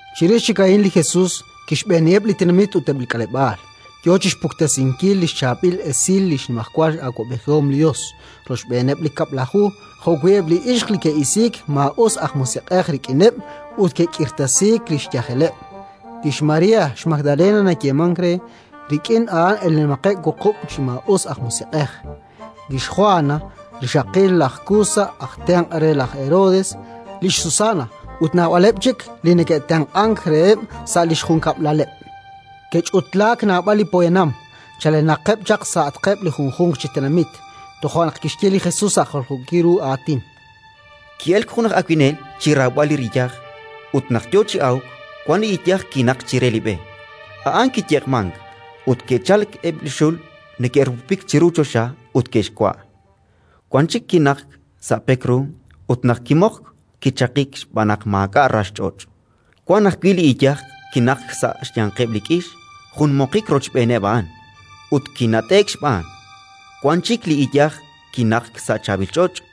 Chirix chik a'in li Jesus kixb'eeniheb' li tenamit ut eb' li k'aleb'aal, yo chi xpuktesinkil li xchaab'il esil li xnimajwal awab'ejihom li Yos, rochb'eeneb' li Kab'laju jo'wi' eb' li ixq li ke'isiik maa'usej musiq'ej rik'ineb' ut ke'k'irtasiik li xyajeleb': lix María, xMagdalena nayeemank re, rik'in a'an elenaqeb' wuqub' chi maa'us aj musiq'ej, lix Jwana, rixaqil laj Kusa aj tenq' re laj Herodes, lix Susana ut naab'aleb' chik li neke'tenq'ank reheb' sa' li xjunkab'laleb'. Ke'ch'utlaak naab'al li poyanam, chalenaqeb' chaq sa'atqeb' li junjunq chi tenamit. Toja' naq kixye li Jesus sa' jaljookil ru aatin: “Ki'elk jun aj awinel chi rawb'al li riyaj. Ut naq yo chi awk, wan iyaj kinaqk chire li b'e: a'an kiyeq'mank, ut ke'chalk eb' li xul neke'rupupik chiru choxa ut ke'xwa'. Wan chik kinaqk sa' pek ru, ut naq kimoqk, kichaqik, xb'aan naq maak'a' rax ch'och'. Wan ajwi' iyaj kinaqk sa' xyanqeb' li k'ix: jun moqik rochb'eeneb' a'an, ut kinat'e'k xb'aan. Wan chik iyaj kinaqk sa' chaab'il ch'och':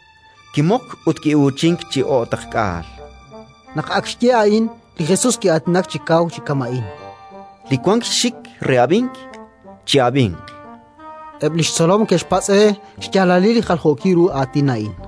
kimoqk ut ki'uuchink chi o'taqk'aal”. Naq ak xye a'in, li Jesus ki'aatinak chi kaw chi kama'in: “Li wank xxik re ab'ink, chi'ab'inq”, chan. Eb' li xtzolom ke'xpatz' re xyaalalil li jaljookil ru aatin a'in,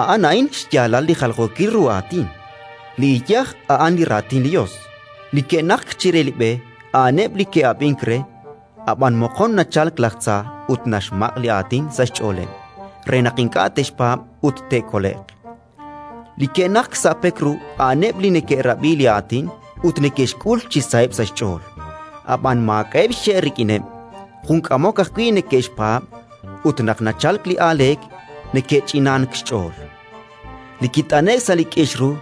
“A'an a'in xyaalal li jaljookil ru aatin: li iyaj a'an li Raatin li Yos. Li ke'naqk chire li b'e a'aneb' li ke'ab'ink re, ab'an moqon nachalk laj tza ut naxmaq' li Aatin sa' xch'ooleb' re naq ink'a' te'xpaab' ut te'kole'q. Li ke'naqk sa' pek ru a'aneb' li neke'rab'i li Aatin ut neke'xk'ul chi saheb' sa' xch'ool, ab'an maak'a'eb' xxe' rik'ineb': jun k'amok ajwi' neke'xpaab' ut, naq nachalk li aaleek, neke'ch'inank xch'ool. Li kit'ane'k sa' li k'ix ru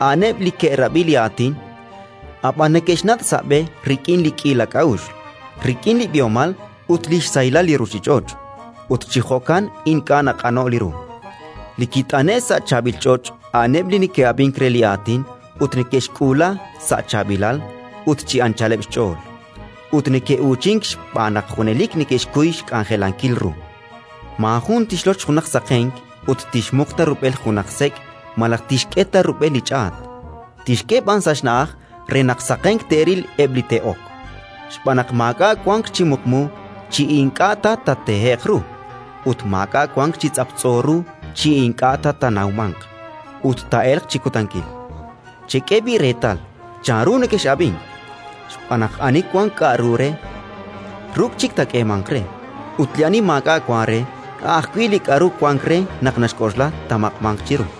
a'aneb' li ke'rab'i li Aatin, ab'an neke'xnat' sa' b'e rik'in li k'iila k'a'uxl, rik'in li b'ihomal ut li xsahilal li ruuchich'och', ut chi jo'kan ink'a' naq'ano'k li ru. Li kit'ane'k sa' chaab'il ch'och' a'aneb' li neke'ab'ink re li Aatin ut neke'xk'uula sa' chaab'ilal ut chi anchaleb' xch'ool, ut neke'uuchink xb'aan naq junelik neke'xkuy xk'anjelankil ru. “Maajun tixloch junaq saqenk ut tixmuq ta rub'el junaq sek' malaj tixk'e ta rub'el li ch'aat; tixk'e b'an sa' xna'aj re naq saqenk te'ril eb' li te'ok. Xb'aan naq maak'a' wank chi muqmu chi ink'a' ta taatehe'q ru, ut maak'a' wank chi tz'aptz'o ru chi ink'a' ta taanawmanq ut taa'elq chi kutankil. “Chek'e b'i' reetal chanru nekex'ab'ink, xb'aan naq ani wank k'aru re, ruk' chik taak'eemanq re; ut ani maak'a' wank re, a' ajwi' li k'aru wank re naq naxk'oxla, taamaq'manq chiru”.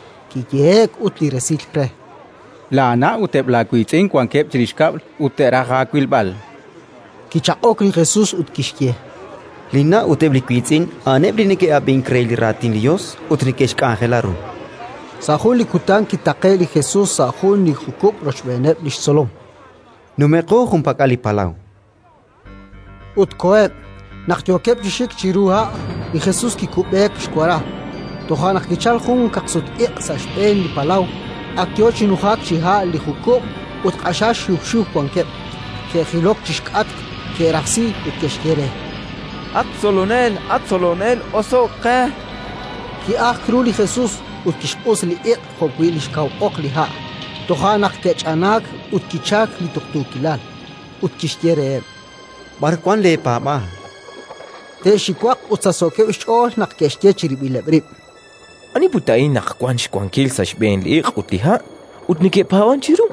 Kiyehe'k ut resil re: —Laana' ut eb' laawiitz'in wankeb' chirix kab'l, ut te'raj aawilb'al. Kichaq'ok li Jesus ut kixye: —Linna' ut eb' li wiitz'in a'aneb' li neke'ab'ink re li Raatin li Yos ut neke'xk'anjela ru. Naq kich'anaak li kaqsut-iq' Sa' jun li kutan kitaqe'k li Jesus sa' jun li jukub' rochb'eeneb' li xtzolom: —Numenqo junpak'al li palaw, chan reheb'. Ut koheb'. Naq yookeb' chi xik chiru ha', li Jesus kikub'eek xwara. Toja' naq kichalk jun kaqsut-iq' sa' xb'een li palaw, ak yo chi nujak chi ha' li jukub' ut q'axal xiw xiw wankeb'. Ke'jilok chi xk'atq, ke'rajsi ut ke'xye re: —At Tzolonel, at Tzolonel, oso'k qe! Ki'ajk ru li Jesus ut kixq'us li iq' jo'wi' li xkaw oq li ha'; toja' naq ke'ch'anaak ut kichalk li tuqtuukilal. Ut kixye reheb': —B'ar wank leepaab'aal? Te'xiwaq ut sachsookeb' xch'ool naq ke'xye chirib'ileb' rib': —Ani put a'in naq wank xwankil sa' xb'een li iq' ut li ha', ut neke'paab'ank chiru?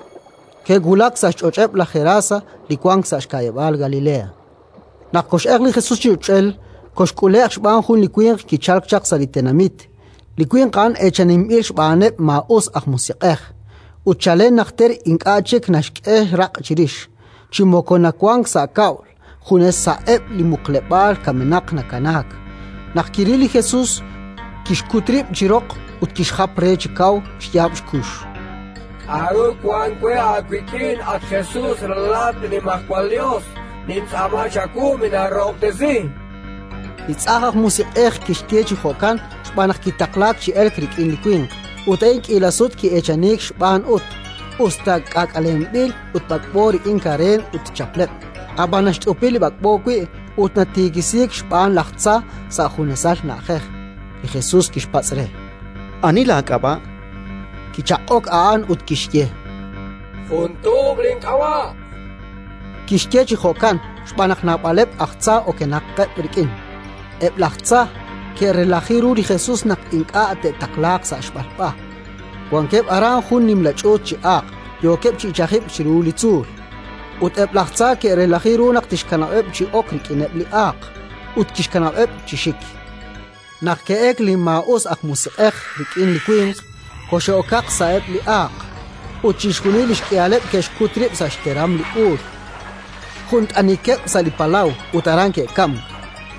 Ke'wulak sa' xch'och'eb' laj Gerasa, li wank sa' xka'yab'aal Galilea. Naq kox'elq li Jesus chi ch'och'el, kolk'ule'q xb'aan jun li winq kichalk chaq sa' li tenamit. Li winq a'an eechaninb'il xb'aaneb' maa'us aj musiq'ej, ut chalen najter ink'a' chik naxk'e raq' chirix, chi moko nawank sa' kab'l, junes sa'eb' li muqleb'aal kamenaq nakanaak. Naq kiril li Jesus, kixkut rib' chi roq ut kixjap re chi kaw xyaab' xkux: —K'aru wank we aawik'in, at Jesus, Ralalat li Nimajwal Yos? Nintz'aama chawu, minaarahob'tesi! Li tz'ajn aj musiq'ej kixye chi jo'kan xb'aan naq kitaqlaak chi elk rik'in li winq: ut a'in k'iila sut ki'eechaniik xb'aan ut, us ta k'aak'alenb'il ut b'ak'b'o rik'in kareen ut chapleb', ab'anan naxt'upi li b'ak'b'o wi' ut natiikisiik xb'aan laj tza sa' junesal na'ajej. Li Jesus kixpatz' re: —Ani laak'ab'a'? Kichaq'ok a'an ut kixye: —Jun tuub' link'ab'a'. Kixye chi jo'kan xb'aan naq naab'aleb' aj tza okenaqeb' rik'in. Eb' laj tza ke'relaji ru li Jesus naq ink'a' te'taqlaaq sa' xb'alb'a. Wankeb' aran jun nimla ch'uut chi aaq, yookeb' chi ichajib'k chiru li tzuul; ut eb' laj tza ke'relaji ru naq tixkanab'eb' chi ok rik'ineb' li aaq. Ut kixkanab'eb' chi xik. Naq ke'elk li maa'usej musiq'ej rik'in li winq, koxe'okaq sa'eb' li aaq; ut chixjunil li xk'ihaleb' ke'xkut rib' sa' xteram li uul, jun t'anikeb' sa' li palaw, ut aran ke'kamk.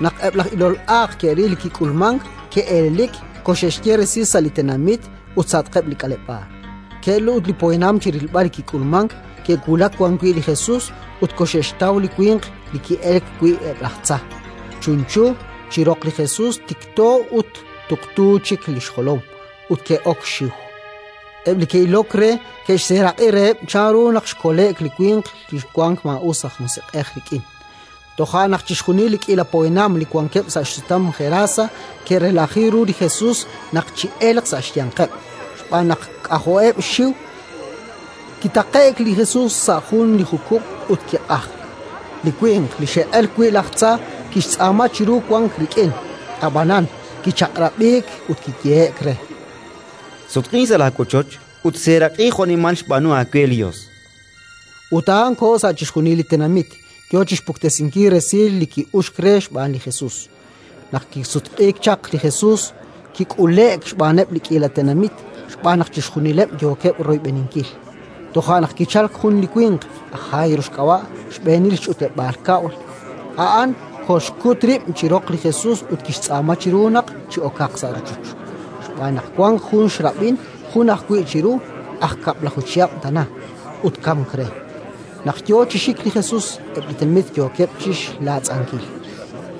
Naq eb' laj ilol aaq ke'ril li kik'ulmank, ke'elelik, koxe'xye resil sa' li tenamit ut sa'atqeb' li k'aleb'aal. Ke'elk ut li poyanam chi rilb'al li kik'ulmank, ke'wulak wan wi' li Jesus ut koxe'xtaw li winq li ke'elk wi' eb' laj tza, chunchu, chi roq li Jesus, tiqto ut tuqtu chik li xjolom. Ut ke'ok xxiw. Eb' li ke'ilok re ke'xseeraq'i reheb' chanru naq xkole'k li winq li xwank maa'us aj musiq'ej rik'in. Toja' naq chixjunil li k'iila poyanam li wankeb' sa' xsutam Gerasa ke'relaji ru li Jesus naq chi'elq sa' xyanqeb', xb'aan naq k'ajo'eb' xxiw. Kitaqe'k li Jesus sa' jun li jukub' ut kiq'ajk. Li winq li xe'elk wi' laj tza kixtz'aama chiru wank rik'in; ab'anan kichaq'rab'iik ut kiyehe'k re: —Sutq'in sa' laawochoch ut seeraq'i jo'nimal xb'aanu aawe li Yos, chu'uxk re. Ut a'an koho sa' chixjunil li tenamit, yo chi xpuktesinkil resil li ki'uxk re xb'aan li Jesus. Naq kisutq'iik chaq li Jesus, kik'ule'k xb'aaneb' li k'iila tenamit, xb'aan naq chixjunileb' yookeb' royb'eninkil. Toja' naq kichalk jun li winq, aj Jairo xk'ab'a', xb'eenil li ch'utleb'aal kab'l. A'an kolxkut rib' chi roq li Jesus ut kixtz'aama chiru naq chi'okaq sa' rochoch. Xb'aan naq wank jun xrab'in, jun ajwi' chiru, aj kab'laju chihab' tana, ut kamk re. Naq yo chi xik li Jesus, eb' li tenamit yookeb' chi xlaatz'ankil.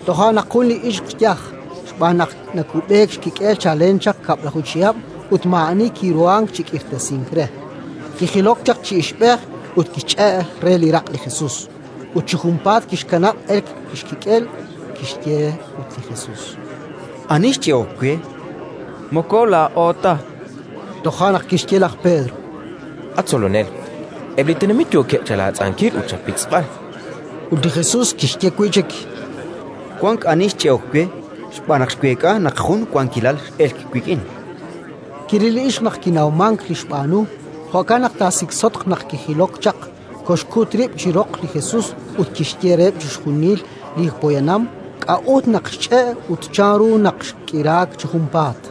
Toja' naq jun li ixq yaj (xb'aan naq nakub'eek xkik'el chalen chaq kab'laju chihab' ut maa'ani kiruhank chi k'irtasink re) kijilok chaq chi ixb'ej ut kixch'e' re li raq' li Jesus. Ut chi junpaat kixkanab' elk li xkik'el. Kixye ut li Jesus: —Ani xch'e'ok we? —Moko laa'o ta, chankeb' chixjunileb'. Toja' naq kixye laj Pedro: —At Tzolonel, eb' li tenamit yookeb' chalaatz'ankil ut chapitz'b'al. Ut li Jesus kixye wi' chik: —Wank ani xch'e'ok we xb'aan naq xweek'a naq jun wankilal x'elk wik'in. Kiril li ixq naq kinawmank li xb'aanu; jo'kan naq taasiksotq naq kijilok chaq, koxkut rib' chi roq li Jesus ut kixye reheb' chixjunil li poyanam k'a'ut naq xch'e' ut chanru naq xk'iraak chi junpaat.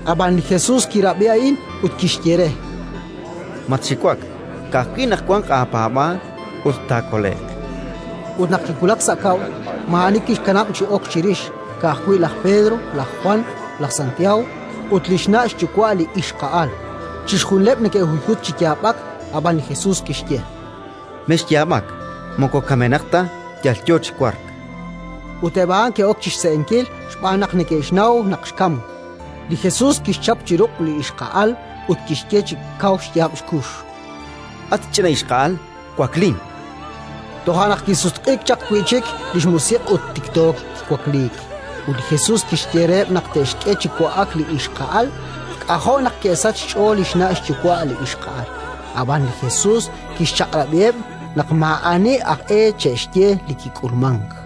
Ab'an li Jesus kirab'i a'in ut kixye re: —Matxiwak, ka'ajwi' naq wanq aapaab'aal ut taakole'q. Ut naq kiwulak sa' kab'l, maa'ani kixkanab' chi ok chirix, ka'ajwi' laj Pedro, laj Jwan, laj Santiago ut li xna' xyuwa' li ixqa'al. Chixjunileb' neke'huyhutk chi yaab'ak, ab'an li Jesus kixye: —Mexyaab'ak: moko kamenaq ta, yal yo chi wark. Ut eb' a'an ke'ok chi xse'enkil xb'aan naq neke'xnaw naq xkamk. Li Jesus kixchap chi ruq' li ixqa'al ut kixye chi kaw xyaab' xkux: —At ch'ina ixqa'al, waklin! Toja' naq kisutq'iik chaq wi' chik li xmusiq' ut tikto kiwakliik; ut li Jesus kixye reheb' naq te'xk'e chi wa'ak li ixqa'al. K'ajo' naq ke'sachk xch'ool li xna' xyuwa' li ixqa'al. Ab'an li Jesus kixchaq'rab'iheb' naq maa'ani aj e che'xye li kik'ulmank.